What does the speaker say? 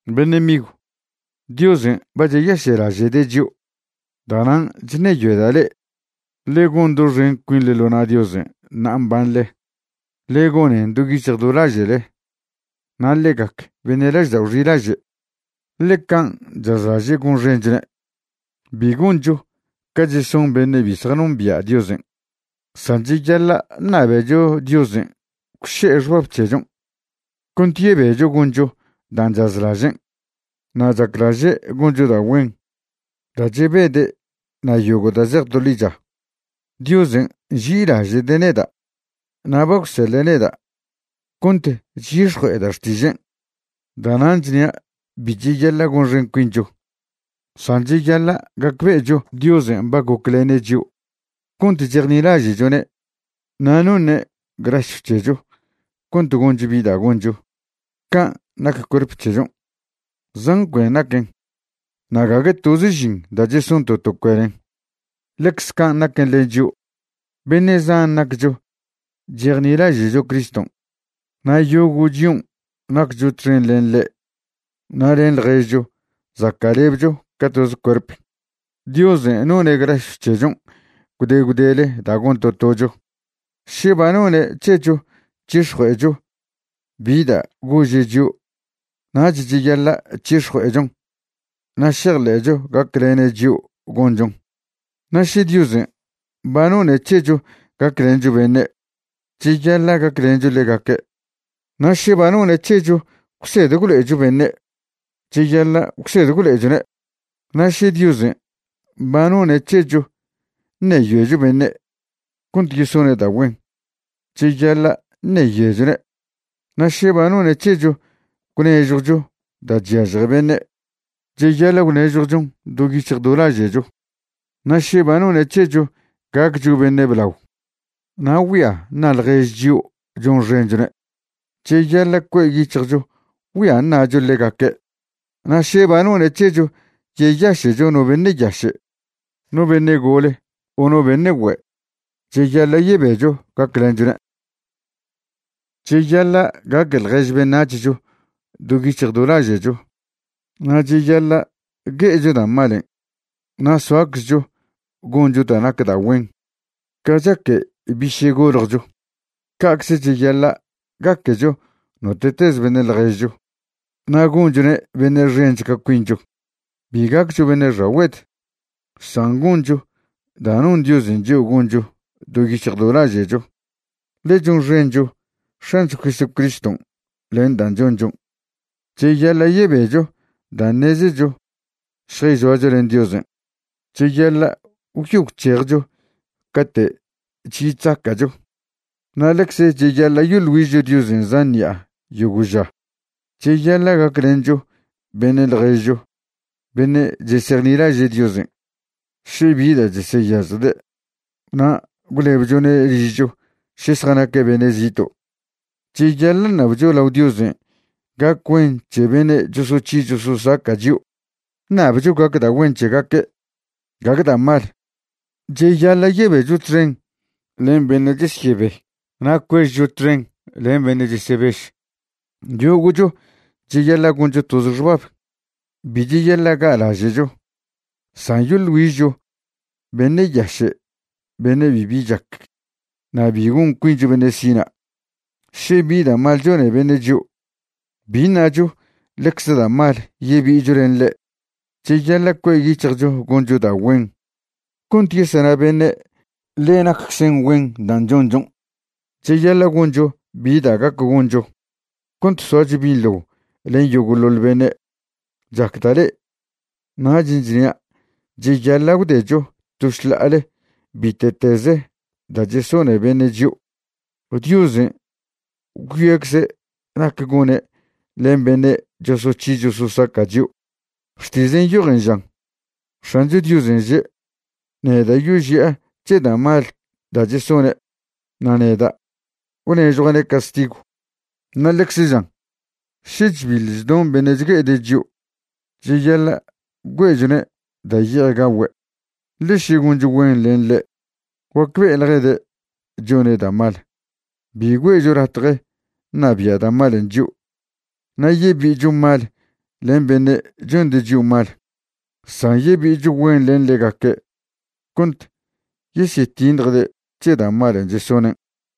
Beṉe' migw, Diosen' ba cheyaše'laže'de' chio'. Da'nan' chṉeyoeda' le'e ḻe gon doxen cuinḻe ḻo na' Diosen' ṉa'a mbanḻe. Ḻe gonen do yic̱hj do laže'le. Na' ḻe gac beṉe' laždao' xilaže' ḻe can' chazlaže' gonxenchone'. Bi goncho ca cheson beṉe' bi zjanombia' Diosen'. San cheyaḻa' ṉabecho Diosen' gwše'e xbab c̱hechon' cont yebecho goncho dan' chazlažen'. Na' chaclaže' goncho da' güen, da' chebede' na' yogo' da' zej to ḻicha. Diosen' nži'ilaže'de' neda' na' ba gwseḻe' neda' cont chyix̱jue'eda' xtižen'. Da'nan' chnia' bi cheyaḻa' gonxen cuincho, san cheyaḻa' gacbe'echo Diosen' ba goclene' chio' cont chejnilaže'chone' na' noṉe' grasyw c̱hecho cont goncho bi da' goncho. Can' nac cuerp c̱hechon', zan cuen naquen na' gague toze žin da' cheson to to cuenen. Ḻecze can' naquen len chio', beṉe' zan naccho chejnilaže'cho Criston' na' yogo' chion' naccho txen len ḻe' na' len ḻježcho zaca'lebcho ca toze cuerp. Diosen' none' grasyw c̱hechon' gwde gwdele da' gon to tocho. Še ba none' c̱hecho c̱hix̱jue'echo bi da' gože' chio', nach cheyaḻa' c̱hix̱jue'echon na' šejḻe'cho gaclene' chio' gonchon. Na' še Diosen' ba none' c̱hecho gaclencho beṉe', cheyaḻa' gaclencho ḻegaque'. Na' še ba none' c̱hecho gwsed gwlo'echo beṉe', cheyaḻa' gwsed gwlo'echone'. Na' še Diosen' ba none' c̱hecho ṉeyoecho beṉe' cont yesone' da' güen, cheyaḻa' ṉeyoechone'. Na' še ba none' c̱hecho gwnežjwcho da' chyažje beṉe', cheyaḻa' gwnežjwchon do yic̱hj do laže'cho. Na' še ba none' c̱hecho gaccho beṉe' blao na' güia ṉa' ḻjež chio' chonxenchone', cheyaḻa' cue' yic̱hjcho güia ṉa'cho ḻegaque'. Na' še ba none' c̱hecho yeyaše'cho no beṉe' yaše', no beṉe' gole o no beṉe' güe', cheyaḻa' yebecho gaclenchone'. Cheyaḻa' gaque ḻjež beṉac̱hcho do yic̱hj do laže'cho, na' cheyaḻa' gue'echo da' malen' na' soaczcho goncho da' nac da' güen. Ca chaque biše' goljcho, ca'cze cheyaḻa' gaquecho note'teze beṉe' ḻježcho na' gonchone' beṉe' xench ca cuincho. Bi gaccho beṉe' xagüed, san goncho da' non Diosen' chio' goncho do yic̱hj do laže'cho, ḻe chonxencho X̱ancho Jesucriston' len dan' chonchon'. Cheyaḻa' yebecho da' ṉezecho šjayzoacho len Diosen'. Cheyaḻa' gwyo gwc̱hejcho cate' chyi chzaca'cho. Na' ḻecz cheyaḻa' yoḻ güižcho Diosen' zan ṉi'a yogo' ža. Cheyaḻa' gaclencho beṉe' ḻježcho beṉe' chesejnilaže' Diosen' še bi da' cheseyažjde' na' gwlebchone' ližcho še zjanaque' beṉe' zito'. Cheyaḻa' ṉabcho lao Diosen' gac güen c̱he beṉe' chosoc̱hi chososaca' chio'. Ṉabcho gac da' güen c̱hegaque', gague da' mal. Cheyaḻa' yebecho txen len beṉe' chesyebe na' cuežcho txen len beṉe' chesebež. Yogo'cho cheyaḻa' goncho toze xbab. Bi cheyaḻa' ga'laže'cho, san yoḻ güižcho beṉe' yaše' beṉe' bibi chac na' bi gon cuincho beṉe' sina'. Še bi da' mal chone beṉe' chio', bi ṉacho ḻecze da' mal yebi'icho len ḻe'. Cheyaḻa' cue' yic̱hjcho goncho da' güen cont yesena beṉe' ḻe naczen güen dan' chonchon'. Cheyaḻa' goncho bi da' gac goncho cont soacho binḻo len yogo'ḻoḻ beṉe'. Chacda' le'e, nachen' chnia' cheyaḻa' gwdecho to šḻa'ale bite'teze da' chesone beṉe' chio'. Diosen' gwyoecze' nac gone' len beṉe' chosoc̱hi chososaca' chio'. Xtižen' nyojen žan: “X̱ancho Diosen' že': Neda' yoži'a c̱he da' mal da' chesone', na' neda' gwnežjua'ne' castigw.” Na' ḻecze žan: “Še chbil chdon beṉe' chgue'ede' chio', cheyaḻa' güe'chone' da' ye'ej gagüe'; ḻe še goncho güen len ḻe', guacbe'eḻjede' chone' da' mal.” Bi güe'cho latje ṉabia' da' malen' chio' na' yebi'icho mal len beṉe' chonde' chio' mal, san yebi'icho güen len ḻegaque' cont yesyetiṉjde' c̱he da' malen' chesonen'.